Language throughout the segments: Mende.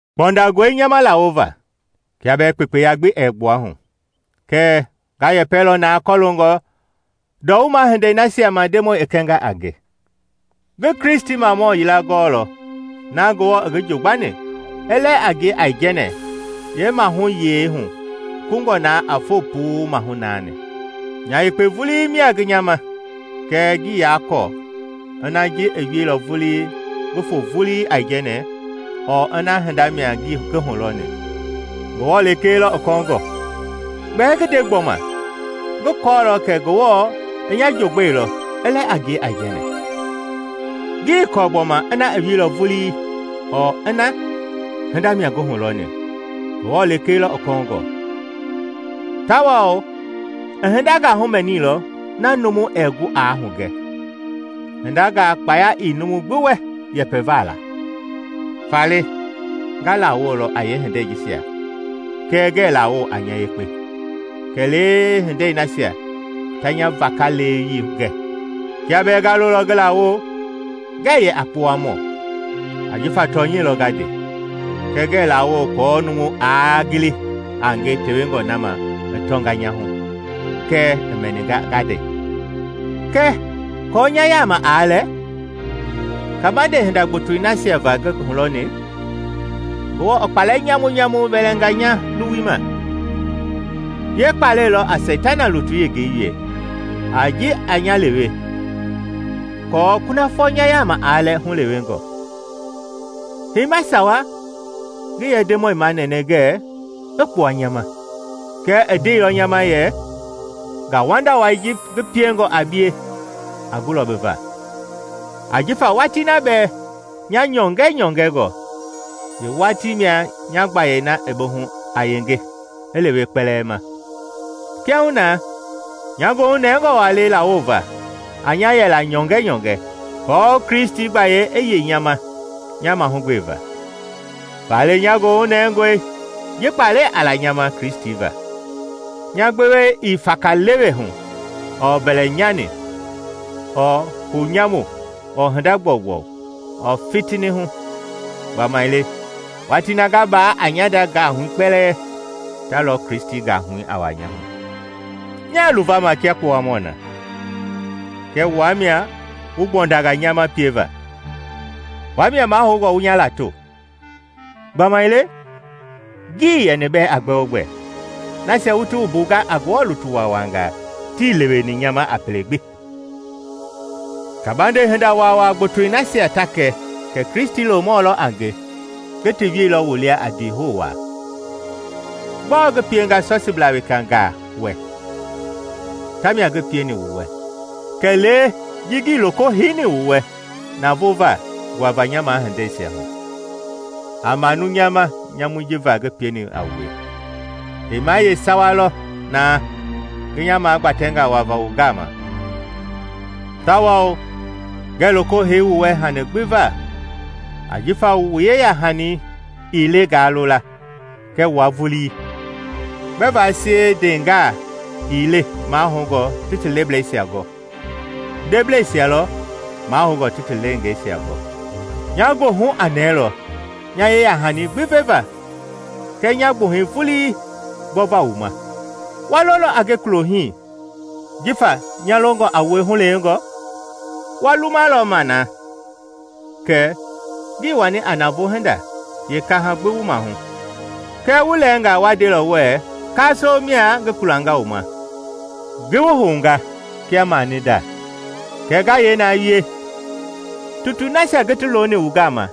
Kpɔndangɔe nya ma lawova kia bɛɛ kpekpeya gbi ɛɛ gbua hu. Kɛɛ nga yɛpɛlɔ naa kɔloongɔ ndɔwuma hindei nasia ma Ndemɔi i kɛnga a nge. Ngi Kristimamɔ yila gɔɔlɔ na Ngewɔ i ngi jogbani i lɛ a ngie Aijɛnɛ yeemahuyei hu kungɔ na a foo puu maahu naani. Nya yekpe vulii mia ngi nya ma, kɛɛ ngii yaa kɔɔ ina ji i wieilɔ vulii ngi foo vulii aijɛnɛ ɔɔ ina hinda mia ngi hulɔni, Ngewɔ lekee lɔ i kɔɔngɔ. Gbɛɛ ngi nde gbɔma, ngi kɔɔlɔ kɛ Ngewɔ i nya jogbɛilɔ i lɛ a ngie aijɛnɛ. Ngii kɔɔ gbɔma ina i wieilɔ vulii ɔɔ ina hinda mia ngi hulɔni Ngewɔ lekee lɔ i kɔɔngɔ, tawao i hindangaa humɛniilɔ na numu ɛɛ gu aa hugɛ, hindangaa kpaya ii numu gbi wɛ yɛpɛva la. Faale nga lawolɔ a yeehindei jisia kɛɛ ngɛɛ lawo a nya yekpe, kɛlee hindei nasia ta nya vakaleweyii gɛ. Kia bɛɛ nga lolɔ ngi lawo, ngɛ yɛ a kpowamɔ, ajifa tɔnyɛi lɔ nga nde. Kɛɛ ngɛɛ lawo aako numu aa gili a nge tewengɔ na ma i tɔnga nya hu kɛɛ i mɛninga nga nde. Kɛɛ aako nya yaama aa lɛ kabande hinda gbotoi nasia va ngi hulɔni, Ngewɔ i kpalɛ nyamunyamu wɛlɛnga nya luwui ma. Yee kpalɛi lɔ a Seitana lutui yengei wie a ji a nya lewe aako kunafɔ nya yaama aa lɛ hulewengɔ. Heima sawa ngi yɛ Ndemɔi manɛnɛ ngɛɛ i kpua nya ma. Kɛɛ i ndeilɔ nya ma yɛ, “Ngauwanda wai ji ngi piengɔ a bie a gulɔ bi va, ajifa watii na ba yɛ nyɔngɛnyɔngɛ, yeewatii mia nya gbayei na i bi hu a yenge i lewe kpɛlɛɛ ma.” Kiahuna nya goohu nɛngɔ waa le lawova a nya yɛla nyɔngɛnyɔngɛ aako Kristi gbayei i yei nya ma nya mahugbeva. Faale nya goohu nɛngɔe ji kpalɛ a la nya ma Kristi va. Nya gbewe ii fakalewe hu ɔɔ mbɛlɛnyani ɔɔ hou nyamu ɔɔ hinda gbɔugbɔu ɔɔ fitini hu. Gbamaile watii na nga baa a nya nda gahui kpɛlɛɛ, ta lɔ Kristi gahui a wuaa nya hu. Nya luvama kia kpowamɔ na, kɛɛ wua mia wu kpɔndanga nya ma pieva. Wua mia mahoungɔ wu nya lato. Gbamaile ngii yɛni bɛɛ a gbɛogbɛ, nasia wu ti wumbunga a Ngewɔ lutu waawangaa tii leweni nya ma a pele gbi. Kabande hinda waawaa gbotoi nasia ta kɛ kɛ Kristi loomɔ mia a nge, ngi ti wielɔ wu lia a ndiihou wa. Gbɔɔ ngi pienga sɔsiblaa wekangaa wɛ tamia ngi pieni wu wɛ, kɛlee ji lekee ngii loko heini wu wɛ navoo va nguava nya mahindeisia hu. A manu nya ma nyamui ji va ngi pieni a wue! Heima yeesawa lɔ na ngi nya magbatɛnga wava wu gama tawao ngɛɛ loko hei wu wɛ hani gbi va ajifa wu yeyahani ii le ngaa lo la kɛ wua vulii. Gbɛva sie ndeengaa ii le mahoungɔ ti ti leblɛisia gɔ, ndebleisia lɔ mahoungɔ ti ti leengeisia gɔ. Nya goohu a nɛɛlɔ nya yeyahani gbi veva kɛɛ nya gbuhɛi vulii gbɔva wu ma. Wa lolɔ a nge kulo hii jifa nya longɔ a wue hulewengɔ? Wa lumalɔ ma na kɛ ngii wani a navoo hinda yeekaha gbi wu maahu. Kɛɛ wu lɛɛnga wa ndelɔ wuɛɛ kaasoo mia ngi kulanga wu ma, ngi wu hounga kia mani a ndei. Kɛɛ nga yee na wie? Tutui nasia ngi ti loni wu gama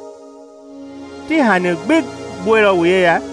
ti hani gbi gbuɛilɔ wu yeya?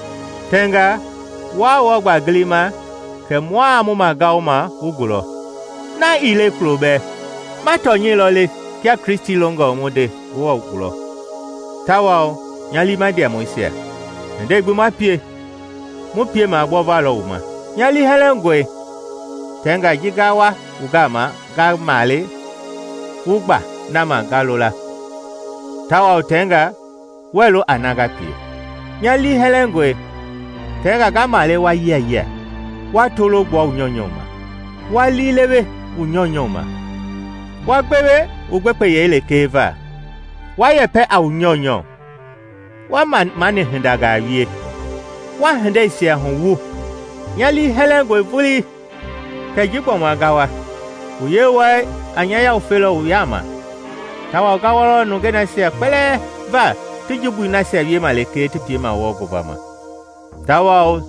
Tɛnga wuaa wɔɔ gba gilima kɛ mua mu magaoma wu gulɔ. Na ii le kulo bɛɛ. Ma tɔnyɛi lɔ le kia Kristi longɔ mu nde Ngewɔ gulɔ, tawao, nya liima ndiamɔisia, hindei gbi ma pie, mu piema gbɔva lɔ wu ma. Nya liihɛlɛngɔe tɛnga ji nga wa wu gama nga male wu gba na ma nga lo la, tawao tɛngaa, wuɛɛ lo a na nga pie. Nya liihɛlɛngɔe tɛngaa nga male wa yianjia, wa tolo gbua wu nyɔunyɔ ma, wa liilewe wu nyɔunyɔ ma, wa gbewe wu gbekpeyei lekee va, wa yɛpɛ a wu nyɔunyɔ, wa mamani hindangaa wie, wa hindeisia huwu. Nya liihɛlɛngɔe vulii kɛ ji gbɔma nga wa, mu Yewɔɛi a nya yawufelɔ wu yaama tawao nga wɔlɔ nungei nasia kpɛlɛɛ va ti jumbui nasia wiema lekee ti piema wɔɔ ngovama, tawao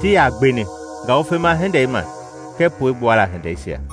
tii yaa gbeni ngawufema hindei ma kɛɛ puegbuala hindeisia.